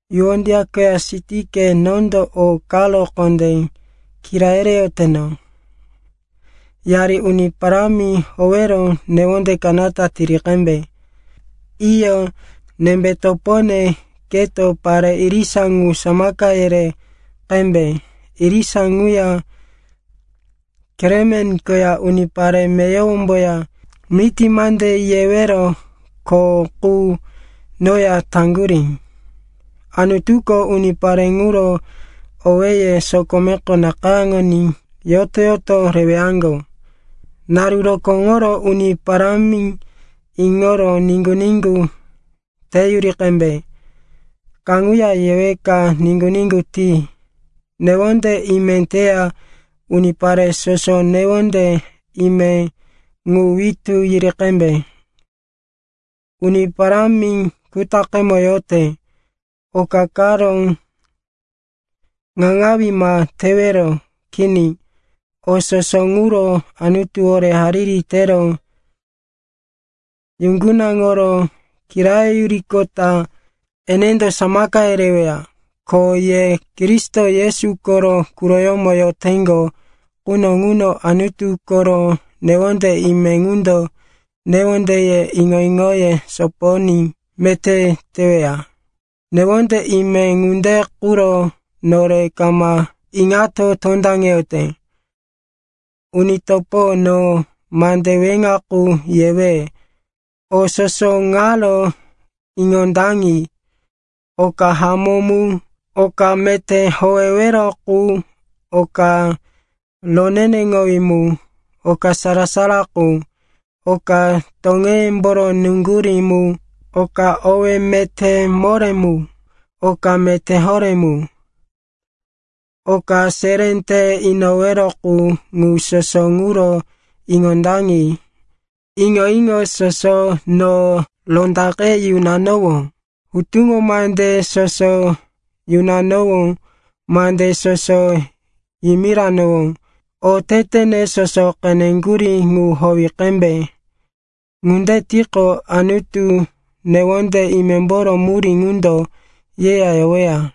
Yuodia koya Sindike, nondo o karo kondé kira yereyoteno, yari Uni Parámi howero newonde kanata tiri qembe. Iyo, nembe topone, keto pare irisa ŋu samaka yere qembe. Irisa ŋuya Klemen koya unipare meyowomboya miti mande yewero kho qu noya taŋgurí. Anutuko unipare ŋuro owéye sokomeko nakayáŋoní yoto-yoto rewaŋgo. Naru rokóŋoro Uni Parámi iŋoro niŋgu-niŋgu teyuri qembe. Kaŋuya yeweka, niŋgu-niŋgu ti. Newonde ime teya unipare soso newonde ime ŋu witú yiri qembe. Uni Parámi kutaqemo yote. Oka karo iŋaŋawí ma tewero. Kini, o soso ŋuro Anutuwore hariri tero yuŋgunaŋoro kirayoyuriqota enendo samaka yereweya. Ko ye Kristo Yesu koro quroyómo yoteŋgo quno ŋuno Anutu koro newonde ime ŋundo newondeye, iŋo-iŋoye sopoyoní meté teweya. Newonde ime ŋunde quro nore kama iŋato tondaŋeyote. Uni topo, no mande weŋa qu yewe. O soso ŋaro iŋondaŋi: oka hamó mu, oka meté howewero qu, oka roneneŋowí mu, oka sara-sara qu, oka toŋeyemboro nuŋgurí mu, oka owé meté moré mu, oka meté horé mu, oka seré te inowero qu, ŋu soso ŋuro iŋondaŋi. Iŋo-iŋo soso no rondaqe yunanowó, hutuŋo mande soso yunanowó, mande soso yimiranowó, otetene soso qeneŋgurí, ŋu howi qembe. Ŋunde tiqo, Anutu, newonde imemboro murí ŋundo yeya yoweya.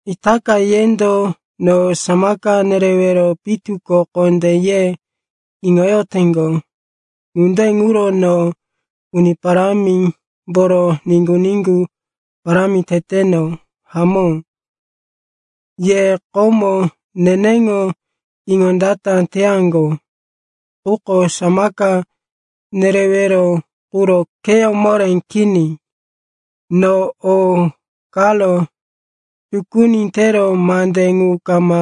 Itaka yendo no samaka nerewero pitu ko kondé ye iŋoyoteŋgo. Ŋunde ŋuro no Uni Parámimboro niŋgu-niŋgu parámi teteno. Hamó, ye komo neneŋo iŋondata teyaŋgo, quko samaka nerewero quro kheyó moré kini. No o karo tukuni tero mande ŋu kama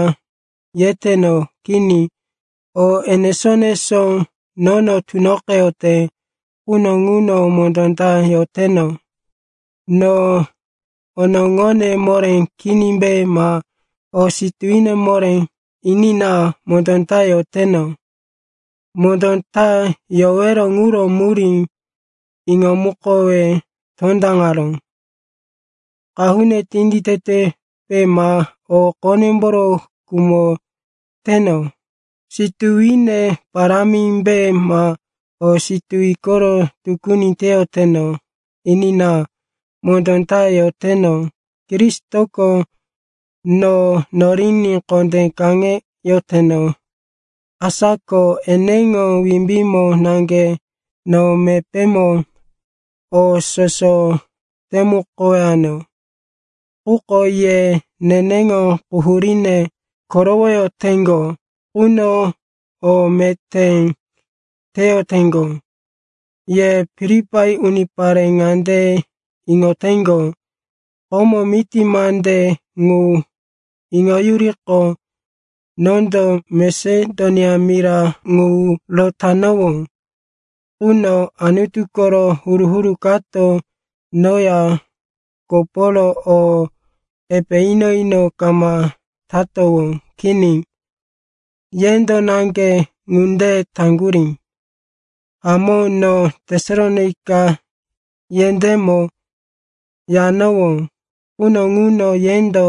yeteno. Kini, o enesó-enesó nono tunoqeyote quno ŋuno mondó ta yoteno. No onoŋone moré kinimbe ma o situwine moré, enina, mondó ta yoteno. Mondó ta yowero ŋuro murí iŋomukowe tondaŋaró. Qahune tinditetepe ma o qonemboro khumoteno, situwine parámimbe ma o situwi koro tukuni teyoteno, enina, mondó ta yoteno. Kristoko no noriní kondé kaŋeyoteno. Asa ko eneŋo wimbímo naŋge no mepémo o soso temukowano. Quko ye neneŋo quhuríne korowoyoteŋgo quno o meté teyoteŋgo. Ye Filipai unipare ŋande iŋoteŋgo, komo miti mande ŋu iŋoyuriqo nondo Masedonia mira ŋu rotanowó quno, Anutu koro huru-huru kato noya koporo o epe ino-ino kama tatowó. Kini, yendo naŋge ŋunde taŋgurí. Hamó, no Tesalonaika yendémo yanowó quno ŋuno, yendo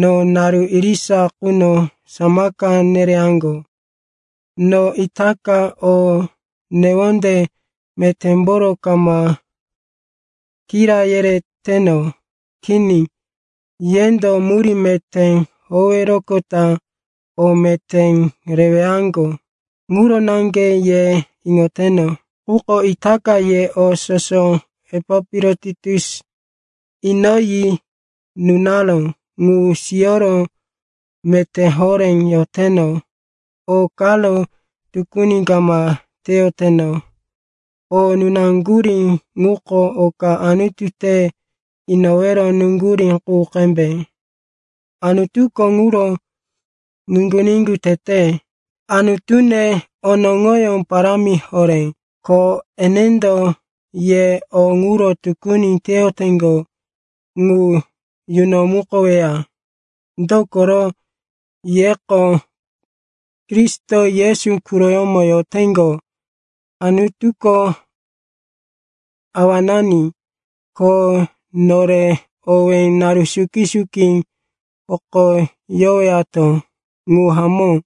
no naru irisa quno samaka nereyaŋgo. No itaka o newonde metémboro kama kira yereteno. Kini. Yendo murí meté howeroqota o meté rewaŋgo ŋuro naŋge ye iŋoteno. Quko itaka ye o soso Epapirotitus inoyi nunaró ŋu siyoro meté horé yoteno. O karo tukuni kama teyoteno. O nunaŋgurí ŋuko oka Anutu te inowero nuŋgurí qu qembe, Anutuko ŋuro niŋgu-niŋgu tete. Anutune onoŋoyó parámi horé, ko enendo ye o ŋuro tukuni teyoteŋgo ŋu yunomukoweya. Dokoro yeko Kristo Yesu quroyómo yoteŋgo. Anutuko Awanani, ko nore owí naru suki-suki hokoyowato. Ŋu hamó.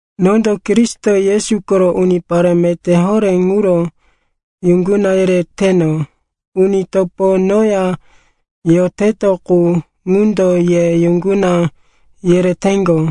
Nondo Kristo Yesu koro unipare meté horé ŋuro yuŋguna yereteno. Uni topo noya yoteto qu, ŋundo ye yuŋguna yereteŋgo.